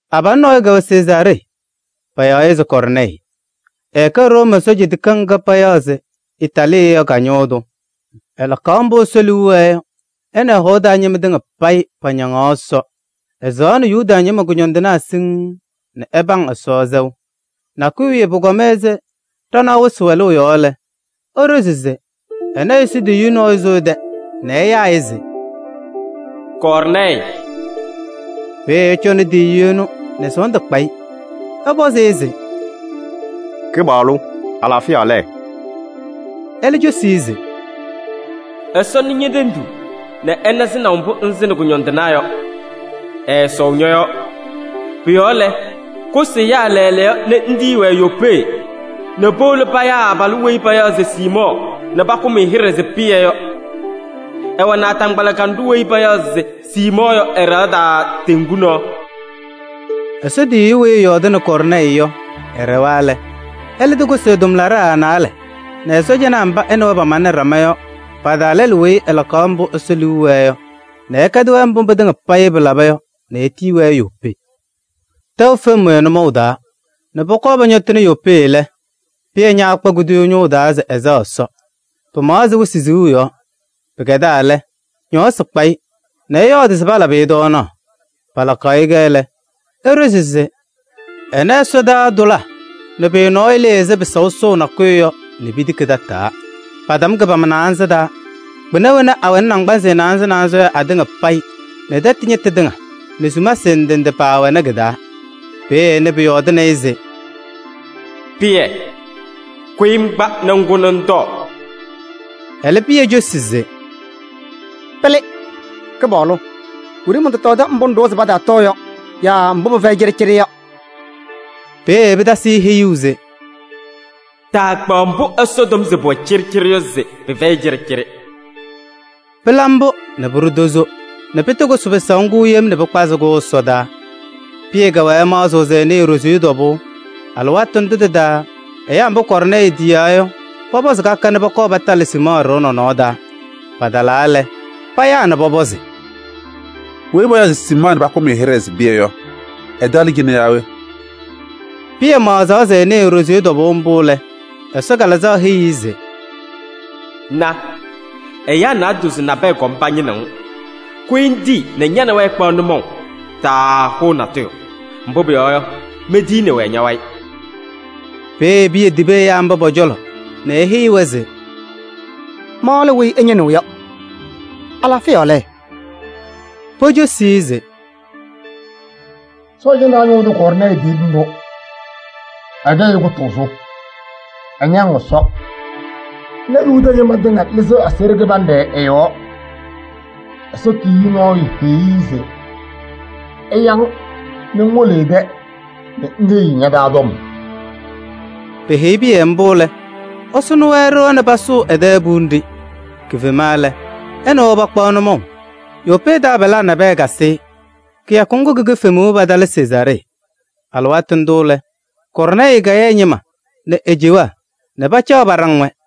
Abalʋ nɔɔyʋ kɛwɛ Sezaaree, payaɣ-ɩ se Kɔɔrnɛɛyɩ. Ɛɛkɛ Room sɔɔjanaa tikaɣ ŋga payaɣ se Itaaliyɛɛ yɔ ka-ñʋʋ tʋ. Ɛlakaɣ mbʋ Ɛsɔ liu wɛɛ yɔ nɛ ɛ nɛ ɛ-hɔʋ taa ñɩma tɩŋa payɩ pañaŋ Ɛsɔ. Ɛsɩŋaɣnɩ Yuda ñɩma kʋñɔndɩnaa siŋŋ nɛ ɛpaŋ Ɛsɔ sɛʋ. Nakʋyʋ wiye pʋkɔma ɛzɩ ɖanaɣ wɩsɩ wɛlʋʋ yɔ lɛ, eɖozi se ɛna Ɛsɔ tiyiyu nɔɔyʋ sʋ ɛ-tɛ nɛ ɛyaa-ɩ se: “Kɔɔrnɛɛyɩ!” Peeye ɛcɔnɩ tiyiyu ɛnʋ nɛ sɔɔndʋ kpa-ɩ nɛ ɛpɔzɩ-ɩ se: “Kɩpaɣlʋ! Alaafɩya lɛ?” Ɛlɛ cosi-i se: “Ɛsɔ nɩ ñe-tenduu nɛ ɛna sɩnaʋ mbʋ ŋsɩnɩ kʋñɔndɩnaa yɔ, ɛɛsɔʋ ñɔ-yɔɔ. Pʋ-yɔɔ lɛ, kʋsɩ ɛyaa lɛɛlɛɛyɔ nɛ ŋtiyi-wɛ Yopee nɛ powolo payaa abalʋ weyi payaɣ se Siimɔɔ nɛ pakʋm-ɩ hɩɖɛ se Pɩyɛ yɔ. Ɛwɛ naataŋgbala kanɖʋ weyi payaɣ se Siimɔɔ yɔ ɛ-ɖɩɣa taa teŋgu nɔɔ.” Ɛsɔ tiyiyu weyi ɛyɔɔdɩnɩ Kɔɔrnɛɛyɩ yɔ, ɛɖɛwa lɛ, ɛlɛ tɩkʋsɩ ɛ-tʋmlaɖaa naalɛ nɛ ɛ-sɔɔjanaa mba ɛ nɛ wɛ pamalɩnɩ ɖama yɔ pa-taa lɛlʋ weyi ɛlakɩ mbʋ Ɛsɔ liu wɛɛ yɔ nɛ ɛkɛdɩ-wɛ mbʋ pɩtɩŋa payɩ pɩlaba yɔ nɛ etiyi-wɛ Yopee. Tɛʋ fem-wɛ nʋmɔʋ taa nɛ pɔkɔɔ pɔñɔtɩnɩ Yopee lɛ, Pɩyɛ ñaakpa kuduyuu ñʋʋ taa se ɛsɛɣ Ɛsɔ, pɩɩmaɣ ɛzɩ wɩsɩ siɣu yɔ. Pɩkɛdaa lɛ, ñɔɔsɩ kpa-ɩ nɛ ɛyɔɔdɩ se palabɩ-ɩ tɔɔnaɣ. Palakaɣ-kɛ lɛ, eɖozi se ɛna ɛsɔdaa tʋlaa nɛ pʋyʋ nɔɔyʋ lɩɩ ɛzɩ pɩsaʋ sɔsɔʋ nakʋyʋ yɔ nɛ pitiki tataa. Patam kɩ-pama naanza taa. Kpɩna wena awɛnɩ naŋgbanzɩ naanza naanza yɔ atɩŋa payɩ nɛ tɛtɛ ñɩtʋ tɩŋa nɛ sumasɩ ndɩ ndɩ paawɛnɩ kɩ-taa. Peeye ɛnɩ pʋyɔɔdʋʋnɩ-ɩ se: “Pɩyɛ! Kʋyɩ ŋkpa nɛ ŋkʋ nɛ ŋtɔɔ!” Ɛlɛ, Pɩyɛ cosi se: “Pɩlɩ! Kɩpaɣlʋ, wiɖiyi mɔntɔtɔɔdɩ mbʋ ŋɖʋwa se pataatɔɔ yɔ yaa mbʋ pɩfɛyɩ cɩɖɩcɩɖɩ yɔ.” Peeye pɩtasɩ-ɩ heyuu se: “Taakpaɣ mbʋ Ɛsɔ tɔm se pʋwɛ cɩɖɩcɩɖɩ yɔ se pɩfɛyɩ cɩɖɩcɩɖɩ.” Pɩla mbʋ nɛ pʋɖʋ tozo nɛ pɩtɩkʋsɩ pɩsaʋ ŋgʋ yem nɛ pɩkpazɩ-kʋ ɛsɔdaa. Pɩyɛ kɛwɛɛ ɛmaɣzɩɣ se ɛnɩɩ e-ɖoziye tɔbʋʋ. Alɩwaatʋ ndʋ tɩ-taa ɛyaa mba Kɔɔrnɛɛyɩ ketiyaa yɔ pɔpɔzɩ ka ka nɛ pɔkɔɔ patalɩ Siimɔɔ ɖɩɣa nɔnɔɔ taa. Patalaa lɛ, payaa nɛ pɔpɔzɩ se: “Weyi payaɣ se Siimɔɔ nɛ pakʋm-ɩ hɩɖɛ se Pɩyɛ yɔ, ɛ-tɛ lɛ cɩnɛ yaa we?” Pɩyɛ maɣzaɣ se ɛnɩɩ e-ɖoziye tɔbʋʋ mbʋ lɛ, Ɛsɔ Kalɩzaɣ heyi-i se: “Na! Ɛyaa naadozo nabɛyɛ kɔm pañɩnɩɣ-ŋ. Kʋyɩ ŋtii nɛ ña nɛ wɛ ɩkpaɣ nʋmɔʋ, taahʋʋ natʋyʋ. Mbʋ pʋyɔɔ yɔ, mentiyini-wɛ ña-wayɩ.” Peeye Pɩyɛ tibi ɛyaa mba pɔ-cɔlɔ nɛ eheyi-wɛ se: “Ma lɛ weyi ɩñɩnɩɣ yɔ. Alaafɩya lɛ?” Pocosi-i se: “Sɔɔjanaa ñʋʋ tʋ Kɔɔrnɛɛyɩ tiyini-ɖʋ. Ɛkɛ ɛyʋ kʋtʋʋzʋ, ɛñaŋ Ɛsɔ nɛ Yuda ñɩma tɩŋa lɩzɩɣ aseɣɖe kɩbanɖɛ ɛ-yɔɔ. Ɛsɔ tiyiyu nɔɔyʋ heyi-i se ɛya-ŋ nɛ ŋwolo ɛ-tɛ nɛ ŋheyi-i ña-taa tɔm.” Peheyi Pɩyɛ mbʋ lɛ, ɛsʋnɩ-wɛ ɖɩɣa nɛ pasʋʋ ɛ-tɛ puwiye nɖɩ. Kifema lɛ, ɛ nɛ wɛ pakpaɣ nʋmɔʋ. Yopee taabalaa nabɛyɛ kasɩ-ɩ. Kɩyakʋ ŋgʋ ki-kifemuu patalɩ Sezaaree. Alɩwaatʋ ndʋ lɛ, Kɔɔrnɛɛyɩ kaya ɛ-ñɩma nɛ e-cewaa nɛ pacaɣ paɖaŋ-wɛ.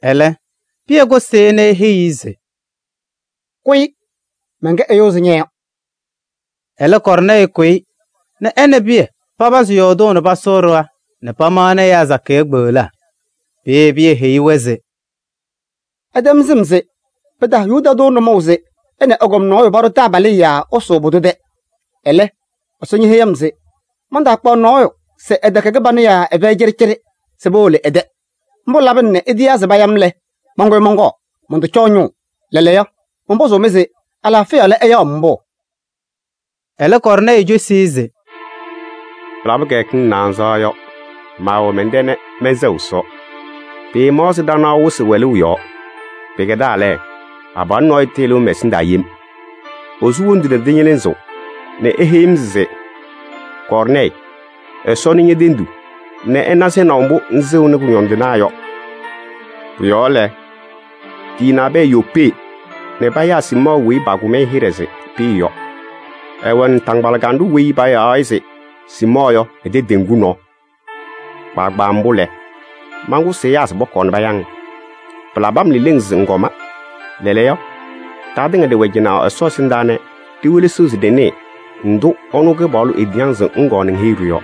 Ɛlɛ Pɩyɛ kʋsɩ-ɩ nɛ eheyi-i se: “Kʋyɩ, mɛnkɛ ɛyʋ ɛzɩ ña yɔ.” Ɛlɛ Kɔɔrnɛɛyɩ kʋyɩ nɛ ɛ nɛ Pɩyɛ papazɩ yɔɔdʋʋ nɛ pasʋʋ ɖɩɣa nɛ pamaɣnɩ ɛyaa sakɩyɛ kpeɣlaa. Peeye Pɩyɛ heyi-wɛ se: “Ɩtɛm sɩm se pɩtaha Yuda tʋ nʋmɔʋ se ɛ nɛ ɛgɔm nɔɔyʋ paɖʋ taabalɩyɛ yaa ɛsʋʋ pʋdʋ tɛ. Ɛlɛ, Ɛsɔ ñeheyi-m se mantaakpaɣ nɔɔyʋ se ɛtɛkɛ kɩbanʋ yaa ɛfɛyɩ cɩɖɩcɩɖɩ se powolo ɛ-tɛ. Mbʋ labɩna nɛ itiyaa se paya-m lɛ, mankʋyɩ mɔnkɔɔ, mɔntɔcɔɔ ñʋʋ. Lɛɛlɛɛyɔ, mɔnpɔzʋʋ-mɩ se alaafɩya lɛ ɩya-m mbʋ?” Ɛlɛ Kɔɔrnɛɛyɩ cosi-i se: “Pɩlabɩ kɩyakɩŋ naanza yɔ, maawɛ mɛn-tɛ nɛ mɛnsɛɣ Ɛsɔ, pɩɩmaɣ ɛzɩ ɖanaɣ wɩsɩ wɛlʋʋ yɔ. Pɩkɛdaa lɛ, abalʋ nɔɔyʋ tɩlɩʋ mɛ-ɛsɩndaa yem. Esu wondu nɛ tɩñɩlɩzɩɣ nɛ eheyi-m se: ‘Kɔɔrnɛɛyɩ! Ɛsɔ nɩ ñe-tenduu nɛ ɛna sɩnaʋ mbʋ ŋsɩŋnɩ kʋñɔndɩnaa yɔ. Pʋ-yɔɔ lɛ, tiyi nabɛyɛ Yopee nɛ payaa Siimɔɔ weyi pakʋm-ɩ hɩɖɛ se Pɩyɛ yɔ. Ɛwɛ naataŋgbala kanɖʋ weyi payaɣ-ɩ se Siimɔɔ yɔ ɛ-tɛ teŋgu nɔɔ.’ Kpaagbaa mbʋ lɛ, mankʋsɩ ɛyaa se pɔkɔɔ paya-ŋ. Pɩlabɩ-m leleŋ se ŋkɔma. Lɛɛlɛɛyɔ, ɖatɩŋa ɖɩwɛ cɩnɛ Ɛsɔ ɛsɩndaa nɛ ɖiwelesiɣ se ɖɩnɩɩ ndʋ ɛnʋ Kɩpaɣlʋ etiyi-ŋ se ŋkɔɔ ŋheyi-ɖʋ yɔ.”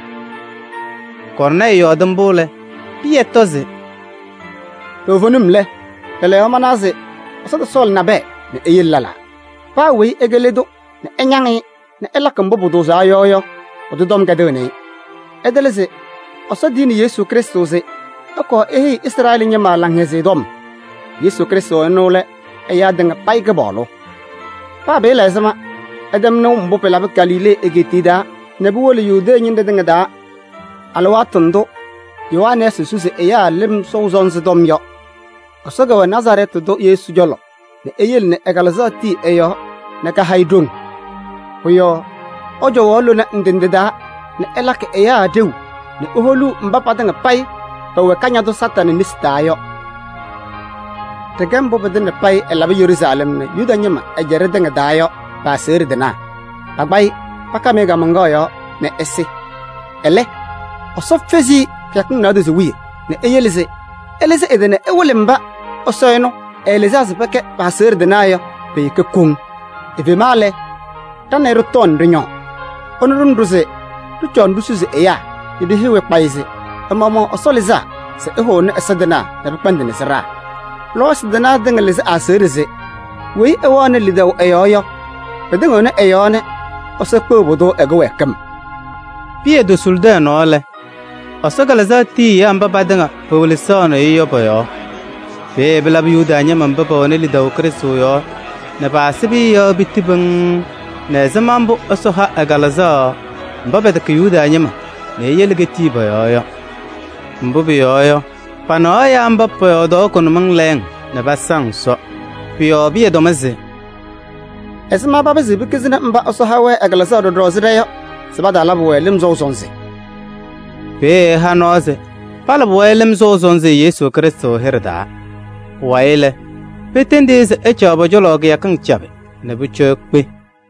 Kɔɔrnɛɛyɩ yɔɔdɩ mbʋ lɛ, Pɩyɛ tɔ se: “Toovenim lɛ, lɛɛlɛɛyɔ manawa se Ɛsɔ tɔsɔɔlɩ nabɛyɛ nɛ eyele lɛlaa: paa weyi ɛkɛ le tʋ nɛ ɛñaŋ-ɩ nɛ ɛlakɩ mbʋ pʋtʋʋzaa yɔ yɔ, pʋdʋ tɔm kɛdɩɣnɩ-ɩ. Ɩtɩlɩ se Ɛsɔ tiyini Yesu Krɩstʋ se ɛkɔɔ eheyi Izrɛɛlɩ ñɩma Laŋhɛzɩyɛ Tɔm. Yesu Krɩstʋ ɛnʋ lɛ ɛyaa tɩŋa payɩ Kɩpaɣlʋ. Paa pɩɩla ɛzɩma, ɩtɛm nɩʋ mbʋ pɩlabɩ Galilee egeetiye taa nɛ puwolo Yudee ñɩnɖɛ tɩŋa taa alɩwaatʋ ndʋ Yohanɛɛsɩ susi ɛyaa lɩm sɔʋ sɔnzɩ tɔm yɔ. Ɛsɔ kɛwɛ Nazarɛɛtɩ tʋ Yesu cɔlɔ nɛ eyele ɛ-Kalɩzaɣ tii ɛ-yɔɔ nɛ kaha-ɩ ɖoŋ. Pʋ-yɔɔ ɛcɔwaɣ lona ndɩ ndɩ taa nɛ ɛlakɩ ɛyaa ɖeu nɛ eholuu mba patɩŋa payɩ pɛwɛ Kañadʋ Satanɩ nesi taa yɔ. Ɖɩkɛ mbʋ pɩtɩŋa payɩ ɛlabɩ Yeruusalɛm nɛ Yuda ñɩma ɛjaɖɛ tɩŋa taa yɔ pɩ-aseɣɖe tɩnaa. Pakpa-ɩ nɛ pakam-ɩ kaamaŋkaɣ yɔɔ nɛ ɛsɩ. Ɛlɛ, Ɛsɔ fezi-i kɩyakɩŋ naadozo wiye nɛ eyele se ɛlɩzɩ ɛ-tɩ nɛ ɛwɩlɩ mba Ɛsɔ ɛnʋ ɛɛlɩzaa se pɛkɛ pɩ-aseɣɖe tɩnaa yɔ pe-ɖeke koŋ. Efema lɛ, ɖa nɛ ɩ ɖɩtɔɔ nɛ ɖɩñɔɔ. Ɛnʋ ɖʋnɩ-ɖʋ se ɖɩcɔɔ ɖisusi ɛyaa nɛ ɖiheyi-wɛ kpayɩ se ɛ-maɣmaɣ Ɛsɔ lɩzaa se ɛhʋnɩ ɛza tɩnaa nɛ pɩkpɛndɩnɩ sɩɖaa. Lɔɔyɩsɩ tɩnaa tɩŋa lɩzɩ ɛ-aseɣɖe se: weyi ɛwɛɣnɩ lidaʋ ɛ-yɔɔ yɔ, pɩtɩŋɩɣnɩ ɛ-yɔɔ nɛ Ɛsɔ kpeɣ pʋdʋ ɛ-kɩwɛɛkɩm.” Pɩyɛ tosulidi ɛ-nɔɔ lɛ, Ɛsɔ Kalɩzaɣ tii ɛyaa mba patɩŋa pewelesaɣnɩ-ɩ yɔ pɔ-yɔɔ. Peeye pɩlabɩ Yuda ñɩma mba pɛwɛnɩ lidaʋ Krɩstʋ yɔɔ nɛ paasɩ Pɩyɛ yɔ piti pɩŋŋ nɛ ɛzɩma mbʋ Ɛsɔ ha ɛ-Kalɩzaɣ mba pɛtɛkɛ Yuda ñɩma nɛ eyele ketii pɔ-yɔɔ yɔ. Mbʋ pʋyɔɔ yɔ, panɩɣaɣ ɛyaa mba pɔyɔɔdaɣ kʋnʋmɩŋ lɛɛŋ nɛ pasaŋ Ɛsɔ. Pʋ-yɔɔ Pɩyɛ tɔm se: “Ɛzɩma papɩzɩɣ pekizini mba Ɛsɔ ha-wɛ ɛ-Kalɩzaɣ ɖɔɖɔ ɛzɩ ɖa yɔ se pataalabɩ-wɛ lɩm sɔʋ sɔnzɩ?” Peeye ɛha nɔɔ se palabɩ-wɛ lɩm sɔʋ sɔnzɩ Yesu Krɩstʋ hɩɖɛ taa. Pʋwayɩ lɛ, petendi-i se ɛcaɣ pɔ-cɔlɔ kɩyakɩŋ cabɩ nɛ pʋcɔ ekpe.